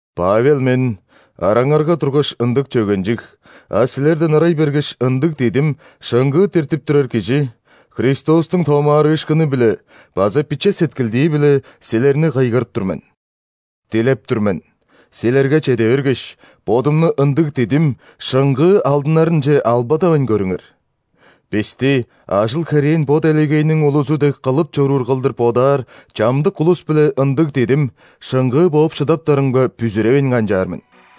Павел мен, «Араңарга тургаш, ындыг чөгенчиг, а силерден ырай бергеш, ындыг дидим, шыңгыы» диртип турар кижи, Христостуң томаарыышкыны-биле база биче сеткилдии-биле a силерни кыйгырып тур мен. Дилеп тур мен: силерге чеде бергеш, бодумну ындыг дидим, шыңгыы алдынарынче албадавайн көрүңер. Бисти ажыл-херээн бо делегейниң улузу дег кылып чоруур кылдыр бодаар чамдык улус-биле ындыг дидим, шыңгыы бооп шыдаптарымга бүзүревейн канчаар мен.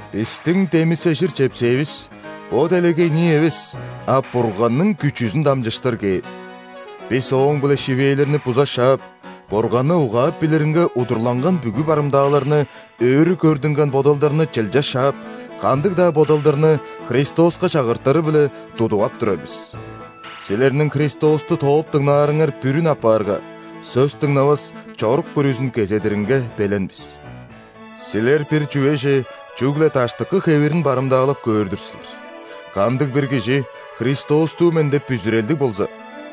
Бистиң демисежир чепсээвис – бо делегейнии эвес, а Бурганның күчүзүн дамчыштыр кээр. Бис ооң-биле шивээлерни буза шаап, Бурганны угаап билиринге удурланган бүгү барымдааларны, өрү көрдүнген бодалдарны чылча шаап, кандыг-даа бодалдарны Христоска чагыртыры-биле тудуп ап турар бис. Силерниң Христосту тооп дыңнаарыңар бүрүн апаарга, сөс дыңнавас чорук бүрүзүн кезедиринге белен бис. Силер бир чүвеже чүгле даштыкы хевирин барымдаалап көөр-дүр силер. Кандыг-бир кижи «Христостуу мен» деп бүзүрелдиг болза,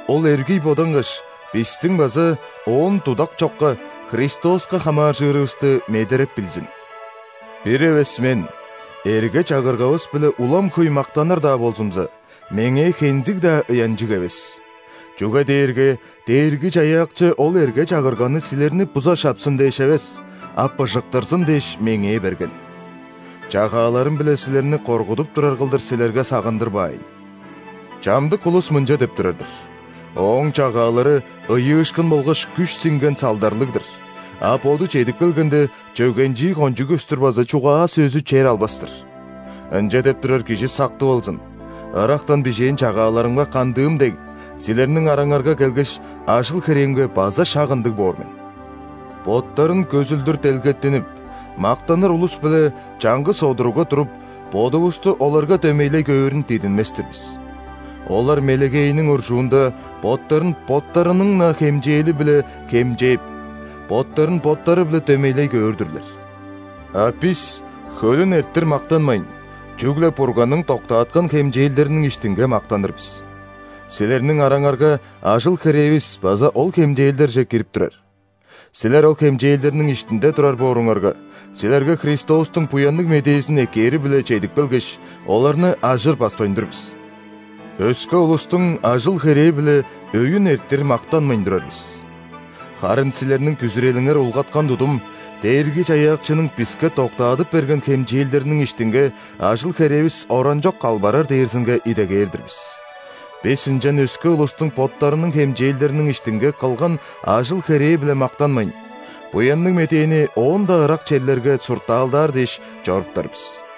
ол эргий бодангаш, бистиң база, оон дудак чокка, Христоска хамааржырывысты медереп билзин. Бир эвес мен эрге-чагыргавыс-биле улам хөй мактаныр-даа болзумза, меңээ хензиг-даа ыянчыг эвес, чүге дээрге Дээрги-Чаяакчы ол эрге-чагырганы силерни буза шапсын дээш эвес, а быжыктырзын дээш, меңээ берген. Чагааларым-биле силерни коргудуп турар кылдыр силерге сагындырбаайн. Чамдык улус мынча деп турар-дыр: «Ооң чагаалары ыйыышкын болгаш күш сиңген салдарлыг-дыр, а боду чедип келгенде, чөгенчии кончуг көстүр база чугаа-сөзү чер албас-тыр». Ынча деп турар кижи сактып алзын: ырактан бижээн чагааларымга кандыым дег, силерниң араңарга келгеш, ажыл-херээмге база шак ындыг боор мен. Боттарын көзүлдүр делгеттинип, мактаныр улус-биле чаңгыс одуругга туруп, бодувусту оларга дөмейлей көөрүн дидинмес-тир бис. Олар мелегейиниң уржуунда боттарын боттарының-на хемчээли-биле хемчээп, боттарын боттары-биле дөмейлей көөр-дүрлер. А бис хөлүн эрттир мактанмайн, чүгле Бурганның доктааткан хемчээлдериниң иштинге мактаныр бис. Силерниң араңарга ажыл-херээвис база ол хемчээлдерже кирип турар. Силер ол хемчээлдерниң иштинде турар бооруңарга, силерге Христостуң Буянныг Медээзин эккээри-биле чедип келгеш, оларны ажыр баспайн тур бис. Өске улустуң ажыл-херээ-биле өйүн эрттир мактанмайн турар бис. Харын силерниң бүзүрелиңер улгаткан тудум, Дээрги-Чаяакчының биске доктаадып берген хемчээлдериниң иштинге ажыл-херээвис оранчок калбарар дээрзинге идегээр-дир бис. Бис ынчан өске улустуң боттарының хемчээлдериниң иштинге кылган ажыл-херээ-биле мактанмайн, Буянныг Медээни оон-даа ырак черлерге суртаалдаар дээш, чоруптар бис.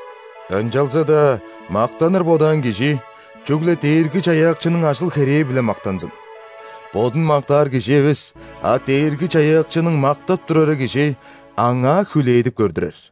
Ынчалза-даа мактаныр бодаан кижи чүгле Дээрги-Чаяакчының ажыл-херээ-биле мактанзын! Бодун мактаар кижи эвес, а Дээрги-Чаяакчының мактап турары кижи Аңаа хүлээдип көрдүрер.